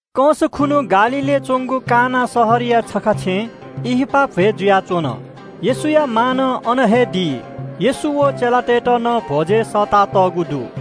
कंस खुन्हु गालीलय् च्वंगु काना शहरया छखा छेँय् ब्याहा भ्वय् जुयाच्वन। येशूया मां नं अन हे दु। येशू व चेलातय्त नं भ्वजय् सःतातःगु दु।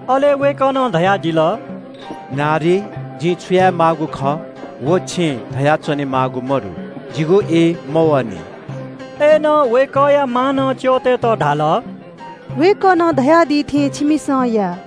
अले वय्कलं धयादिल – “मय्जु, जिं छु यायेमाःगु खः, व छिं धया च्वनेमाःगु मदु। आः तक जिगु ई मवःनि।” अय्नं वय्कःया मांनं च्यःतय्त धाल – “वय्कलं छु धयादी छिमिसं व हे या।”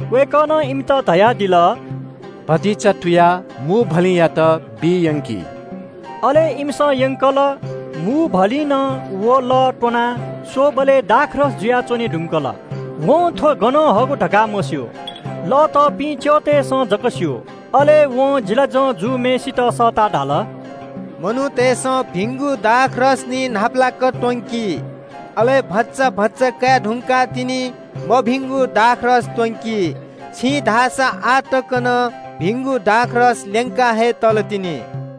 वय्कलं इमित धयादिल – “आः भतिचा तुयाः मूभलिंयाथाय् यंकि।” अले इमिसं यंकल। मूभलिंनं व लःया सवाः कयास्वःबलय् दाखमद्य जुयाच्वने धुंकल। वं थ्व गनं हःगु धकाः मस्यू। लः तःपिं च्यःतय्सं जक स्यू। अले वं जिचाभाजु जूम्हय्सित सःताः धाल – “मनूतय्सं भिंगु दाखमद्य निं न्हापालाक त्वंकी, अले भचा भचा काये धुंकाः तिनि मभिंगु दाखमद्य त्वंकी। छिं धाःसा आः तक नं भिंगु दाखमद्य ल्यंका हे तलतिनि।”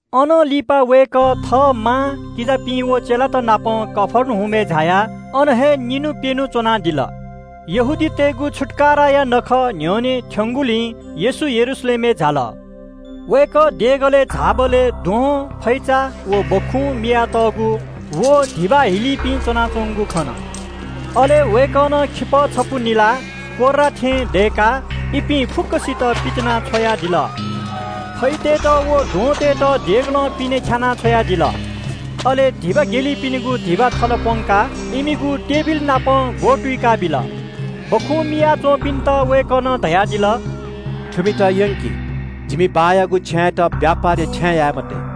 अनं लिपा वय्कः थः मां, किजापिं व चेलात नाप कफर्नहुमय् झायाः अन हे छुं न्हि च्वनादिल। यहूदीतय्गु छुत्काराया नखः न्ह्यःने थ्यंगुलिं येशू यरूशलेमय् झाल। वय्कः देगलय् झाःबलय् द्वहं, फैचा, व सुकुभतु मियाच्वंपिं व धिबा हिलीपिं च्वनाच्वंगु खन। अले वय्कलं खिपः छपु निलाः कोर्रा थें दय्काः इपिं फुक्कसितं पितिनाछ्वयादिल। फैतय्त व द्वहंतय्त देगलं पिने ख्यानाः छ्वयादिल। अले धिबा हिलीपिनिगु धिबा थल प्वंकाः इमिगु टेबिलनापं ग्वतुइकाबिल। सुकुभतु मिया च्वंपिन्त वय्कलं धयादिल – “थुपिं फुक्कं चिज थनं यंकि, जिमि बाःयागु छेँयात छिमिसं ब्यापारया छेँ याये मते।”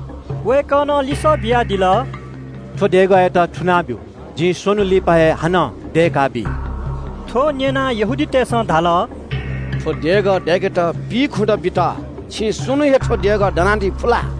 वय्कलं लिसः बियादिल – “थ्व देगःयात थुना बियादिसँ, जिं स्वन्हुं हे थुकियात हानं दय्काबी।” थ्व न्यनाः इमिसं धाल – “थ्व देगः दय्केत पिइखुदँ बित, छिं स्वन्हुं हे थ्व देगः दनादी फु ला?”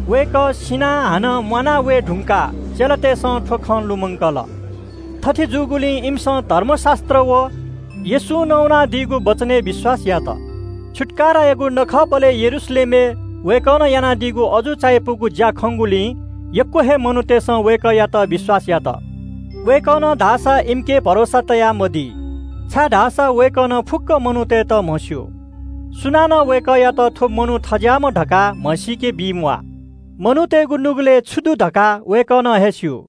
वय्कः सिनाः हानं म्वाना वये धुंकाः चेलातय्सं थ्व खँ लुमंकल। थथे जूगुलिं इमिसं धर्मशास्त्र व येशूं नवानादीगु वचनय् विश्वास यात। छुत्काराया नखःबलय् यरूशलेमय् वय्कलं यानादीगु अजू चायापुगु ज्या खंगुलिं यक्व हे मनूतय्सं वय्कःयात विश्वास यात। वय्कलं धाःसा इमिके भरोसा तयामदी, छाय्धाःसा वय्कलं फुक्क मनूतय्त बांलाक म्हस्यू। सुनानं वय्कःयात थ्व मनू थज्याःम्ह धकाः धयाच्वने म्वाः। मनूतय्गु नुगलय् छु दु धकाः वय्कलं हे स्यू।